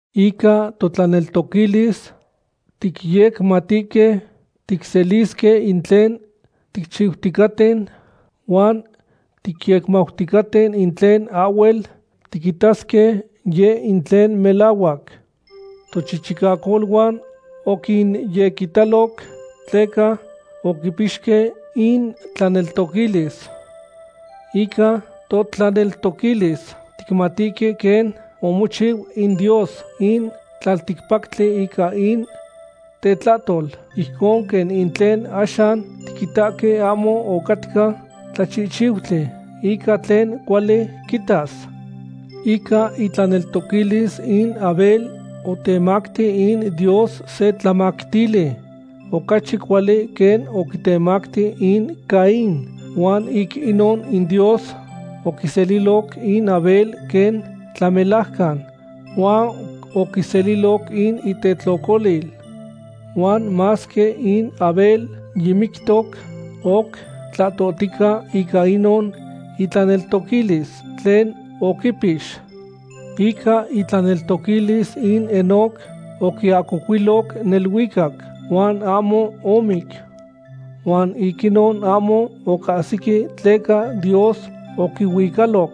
Ica totlaneltoquilis ticyecmatihque ticselisque in tlen ticchixticaten, huan ticyecmauticaten in tlen ahhuel tiquitasque, yeh in tlen melahuac. Tochichicacoluan oquinyequitaloc tleca oquipixque intlaneltoquilis. Ica totlaneltoquilis ticmatihque quen omochiu in Dios in tlalticpactli ica in tetlahtol, ijcon quen in tlen axan tiquitahque ahmo ocatca tlachihchiutli ica tlen cuali quitas. Ica itlaneltoquilis in Abel otemacti in Dios se tlamactili ocachi cuali quen oquitemacti in Caín, huan ic inon in Dios oquiseliloc in Abel quen tlamelajcan huan oquiseliloc in itetlocolil. Huan masque in Abel yimictoc, oc tlahtohtica ica inon itlaneltoquilis tlen oquipix. Ica itlaneltoquilis in Enoc oquiahcocuiloc neluicac, huan ahmo omic. Huan ic inon ahmo ocahsique tleca Dios oquihuicaloc.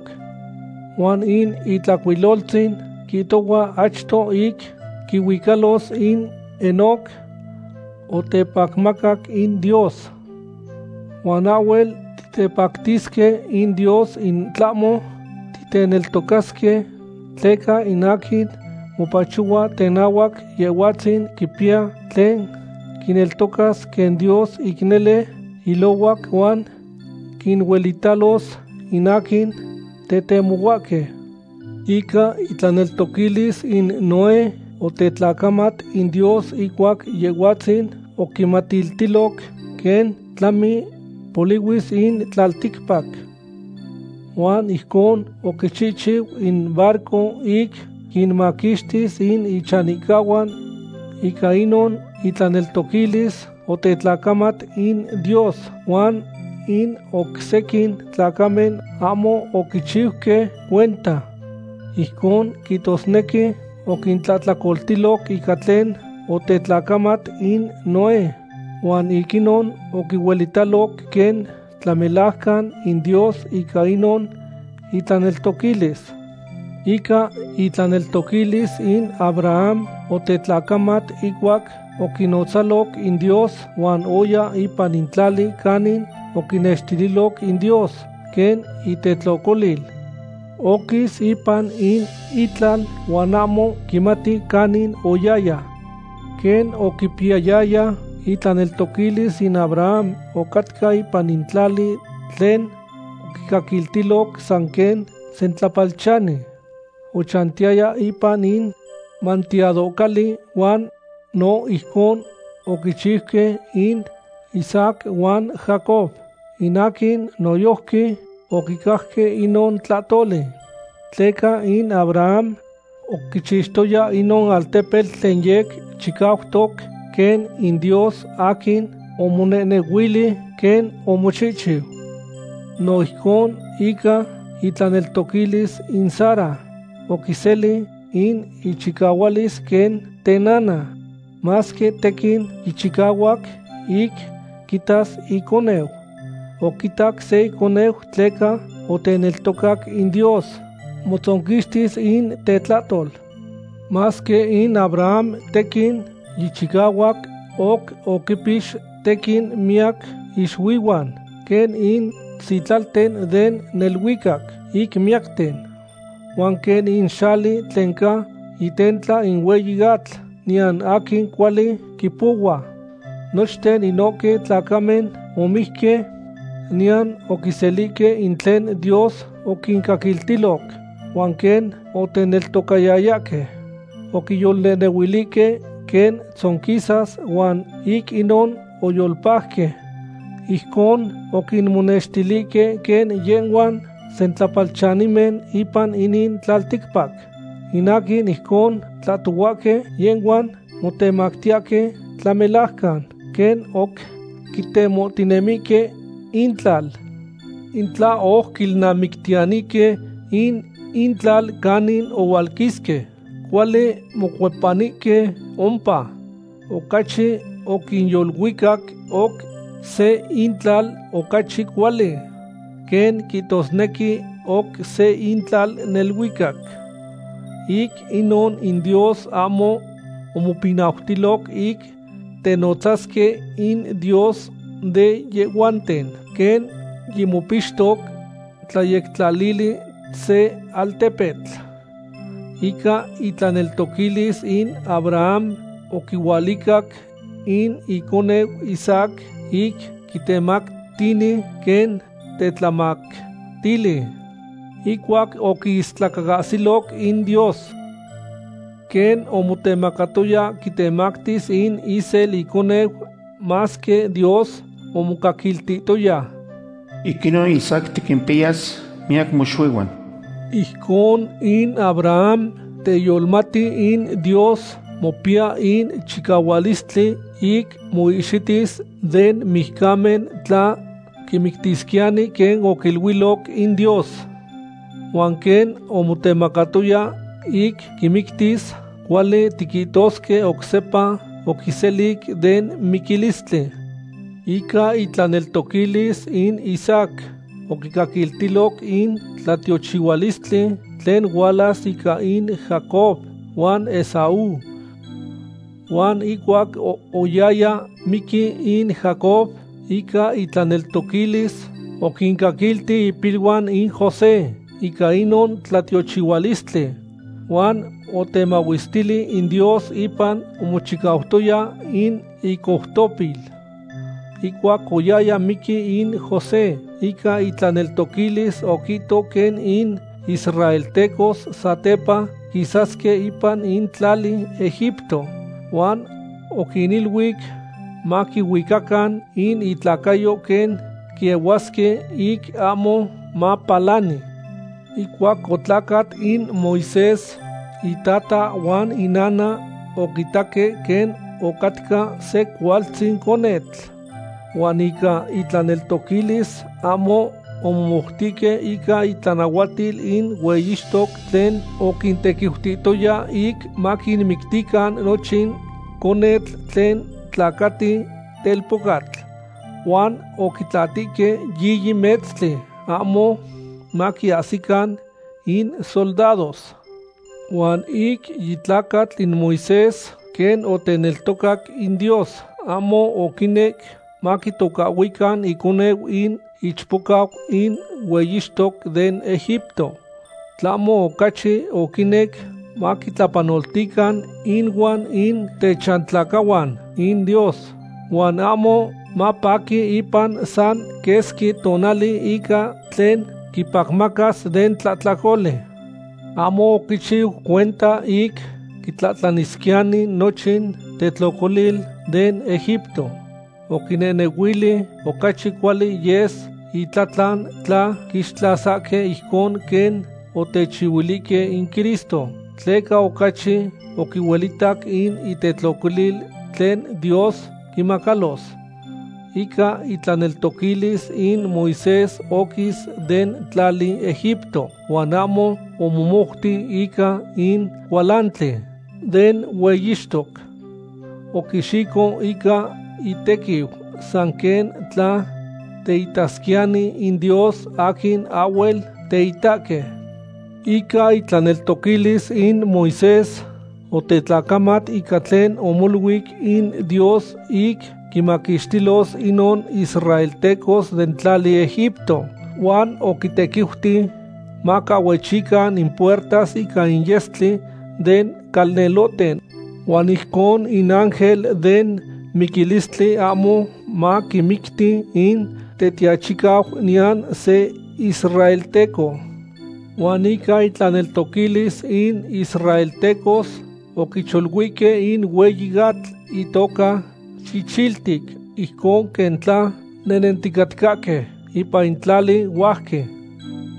Huan in Itlahcuiloltzin quihtohua achto ic quihuicalos, in Enoc otepacmacac in Dios. Huan ahhuel titepactisque in Dios in tlahmo titeneltocasque, tleca in aquin mopachohua tenahuac Yehhuatzin quipiya tlen quineltocas quen Dios ic nele ilohuac huan quinuelitalos in aquin tetemohuahque. Ica itlaneltoquilis in Noé otetlacamat in Dios ihcuac Yehhuatzin oquimatiltiloc quen tlami polihui in tlalticpac. Huan ijcon oquichihchiu in barco ic quinmaquixtis in ichanihcahuan. Ica inon itlaneltoquilis otetlacamat in Dios, huan in oc sequin tlacamen ahmo oquichiuque cuenta. Ijcon quihtosnequi oquintlahtlacoltiloc ica tlen otetlacamat in Noé, huan ic inon oquihuelitaloc quen tlamelajcan in Dios ica inon itlaneltoquilis. Ica itlaneltoquilis in Abraham otetlacamat ihcuac oquinotzaloc in Dios, huan oya ipan in tlali canin oquinextililoc in Dios quen itetlocolil. Oquis ipan in itlal huan ahmo quimati canin oyaya. Quen oquipiyayaya itlaneltoquilis in Abraham, ocatca ipan in tlali tlen oquicaquiltiloc san quen sentlapalchani. Ochantiyaya ipan in manteadohcali huan no ijcon oquichiuque in Isaac huan Jacob, in aquin noyojqui oquicajque inon tlahtoli. Tleca in Abraham oquichixtoya inon altepetl tlen yec chicautoc, quen in Dios aquin omonehnehuili quen omochihchiu. No ijcon ica itlaneltoquilis in Sara oquiseli in ichicahualis quen tenana, masque tequin yichicahuac ic quitas iconeu. Oquitac se iconeu tleca oteneltocac in Dios motzonquixtis in tetlahtol. Masque in Abraham tequin yichicahuac, oc oquimpix tequin miyac ixuihuan, quen in sitlalten den neluicac ic miyacten. Huan quen in xali tlen ca itentla in hueyi atl niyan aquin cuali quipohua. Nochten inohque tlacamen omijque, niyan oquiselihque in tlen Dios oquincaquiltiloc. Huan quen oteneltocayayahque, oquiyolnehnehuilihque quen tzonquisas huan ic inon oyolpajque. Ijcon oquimonextilihque quen yehhuan sentlapalchanimen ipan inin tlalticpac. In aquin ijcon tlahtohuahque, yehhuan motemactiyahque tlamelajcan quen oc quitemohtinemihque intlal. In tla oc quilnamictiyanihque in intlal canin ohualquisque, cuali mocuepanihque ompa. Ocachi oquinyoluicac oc se intlal ocachi cuali, quen quihtosnequi oc se intlal neluicac. Ic inon in Dios ahmo omopinautilo ic tenotzasque in Dios de yehhuanten, quen yimopixtoc tlayectlalili se altepetl. Ica itlaneltoquilis in Abraham oquihualicac in iconeu Isaac ic quitemactini quen tetlamactili ihcuac oquiistlacaahsiloc in Dios. Quen omotemacatoya quitemactis in isel iconeu, masque Dios omocaquiltihtoya: “Ic inon Isaac tiquimpiyas miyac moxuihuan.” Ijcon in Abraham teyolohmati in Dios mopiya in chicahualistli ic moihxitis den mijcamen tla quimictisquiyani quen oquiluiloc in Dios. Huan quen omotemacatoya ic quimictis, cuali tiquihtosque oc sepa oquiselic den miquilistli. Ica itlaneltoquilis in Isaac oquicaquiltiloc in tlatiochihualistli tlen hualas ica in Jacob huan Esaú. Huan ihcuac oyaya miqui in Jacob, ica itlaneltoquilis oquicaquilti ipiluan in José ica inon tlatiochihualistli. Huan otemahuestili in Dios ipan omochicautoya in icoutopil. Ihcuac oyaya miqui in José, ica itlaneltoquilis oquihto quen in israeltecos satepa quisasque ipan in tlali Egipto, huan oquiniluic maquihuicacan in itlacayo quen quiehuasque ic ahmo mapalani. Ihcuac otlacat in Moisés, itata huan inana oquitaque quen ocatca se cualtzin conetl. Huan ica intlaneltoquilis, ahmo omomoutihque ica itlanahuatil in hueyixtoc tlen oquintequiutihtoya ic maquinmictican nochin conetl tlen tlacati telpocatl. Huan oquitlatihque yiyi metztli, ahmo maquiahsican in soldados. Huan ic yitlacatl in Moisés, quen oteneltocac in Dios, ahmo oquinec maquitocahhuican iconeu in ichpocau in hueyixtoc den Egipto. Tlahmo ocachi oquinec maquitlapanoltican inuan in techantlacahuan in Dios, huan ahmo mapaqui ipan san quesqui tonali ica tlen quipacmacas den tlahtlacoli. Ahmo oquichiu cuenta ic quitlanisquiyani nochin tetlocolil den Egipto. Oquinehnehuili ocachi cuali yes itlatlan tla quixtlasasque ijcon quen otechihuilihque in Cristo, tleca ocachi oquihuelitac in itetlocolil tlen Dios quimacalos. Ica itlaneltoquilis in Moisés oquis den tlali Egipto, huan ahmo omomouti ica in cualantli den hueyixtoc. Oquixico ica itequiu san quen tla teitasquiyani in Dios aquin ahhuel teitahque. Ica itlaneltoquilis in Moisés otetlacamat ica tlen omoluic in Dios ic quinmaquixtilos inon israeltecos den tlali Egipto, huan oquintequiuti macahhuechican in puertas ica in yestli den calnelohten huan ijcon in ángel den miquilistli ahmo maquimicti in tetiachicau niyan se israelteco. Huan ica intlaneltoquilis in israeltecos oquicholuihque in hueyi atl itoca Chichiltic ijcon quen tla nehnenticatcahque ipan tlali huajqui.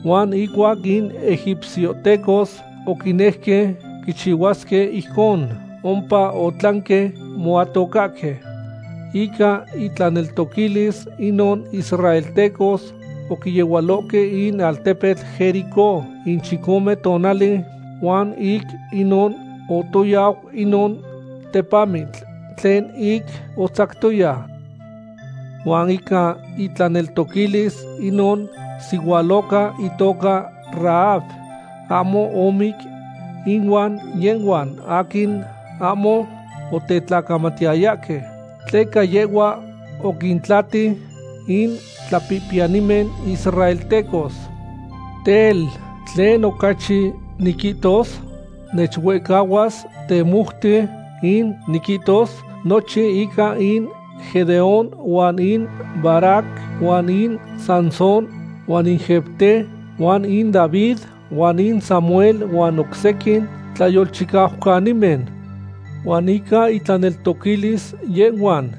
Huan ihcuac in egipciohtecos oquinejque quichihuasque ijcon, ompa otlanque moatocahque. Ica intlaneltoquilis inon israeltecos oquiyehualohque in altepetl Jericó in chicome tonali, huan ic inon otoyau inon tepamitl tlen ic otzactoya. Huan ica itlaneltoquilis, inon sihualoca itoca Rahab ahmo omic inuan yehhuan aquin ahmo otetlacamatiyayahque, tleca yehhua oquintlati in tlapihpiyanimen israeltecos. Tel, ¿tlen ocachi niquihtos? Nechuehcahuas temoute ic niquihtos nochin ica in Gedeón huan in Barac huan in Sansón huan in Jefté huan in David huan in Samuel huan oc sequin tlayolchicaucanimen. Huan ica intlaneltoquilis yehhuan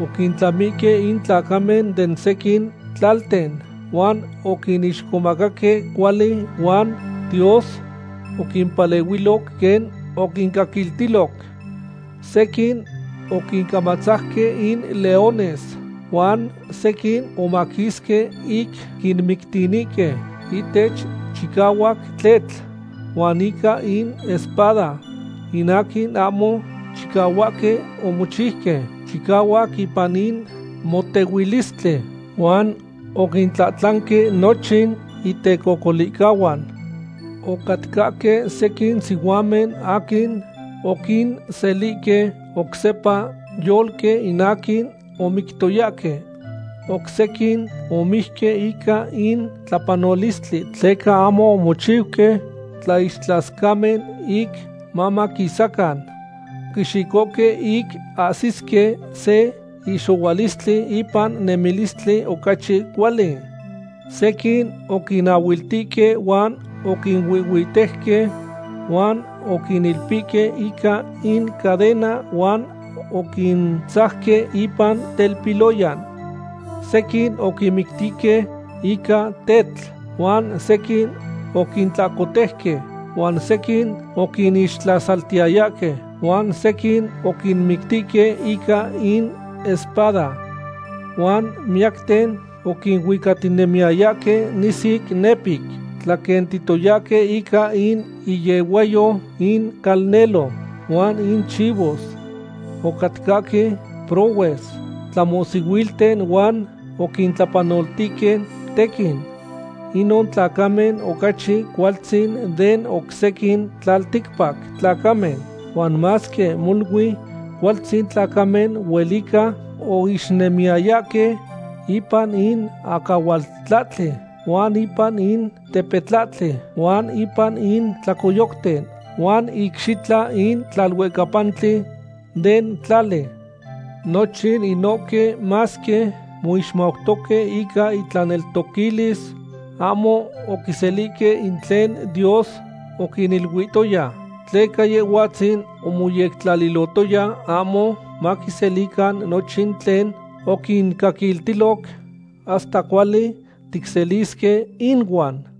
oquintlamihque in tlacamen den sequin tlalten, huan oquinixcomacaque cuali, huan Dios oquimpalehuiloc quen oquincaquiltiloc. Sequin oquincamatzajque in leones, huan sequin omaquisque ic quinmictinihque ihtech chicahuac tletl huan ica in espada. In aquin ahmo chicahuaque omochiuque chicahuac ipan in motehuilistli huan oquintlanque nochin intecocolihcahuan. Ocatcahque sequin sihuamen aquin oquinselihque oc sepa yolque in aquin omictoyahque. Oc sequin omijque ica in tlapanolistli tleca ahmo omochiuque tlaixtlascamen ic mamaquisacan. Oquixicohque ic ahsisque se ihxohualistli ipan nemilistli ocachi cuali. Sequin oquinahhuiltihque huan oquinuihhuitejque, huan oquinilpihque ica in cadena huan oquintzajque ipan telpiloyan. Sequin oquinmictihque ica tetl, huan sequin oquintlahcotejque, huan sequin oquinixtlasaltiyayahque, huan sequin oquinmictihque ica in espada. Huan miyacten oquinuicatinemiyayahque nisic, nepic, tlaquentihtoyahque ica in iyehuayo in calnelo huan in chivos. Ocatcahque prohues, tlamohsihuilten huan oquintlapanoltihque tequin. Inon tlacamen ocachi cualtzin den oc sequin tlalticpac tlacamen, huan masque molui cualtzin tlacamen huelica oixnemiyayahque ipan in acahualtlahtli, huan ipan in tepetlahtli, huan ipan in tlacoyocten, huan icxitla in tlaluecapantli den tlali. Nochin inohque masque moixmautoque ica intlaneltoquilis, ahmo oquiselihque in tlen Dios oquiniluilotoya. Tleca Yehhuatzin omoyectlalihtoya ahmo maquiselican nochin tlen oquincaquiltiloc hasta cuali ticselisque inuan.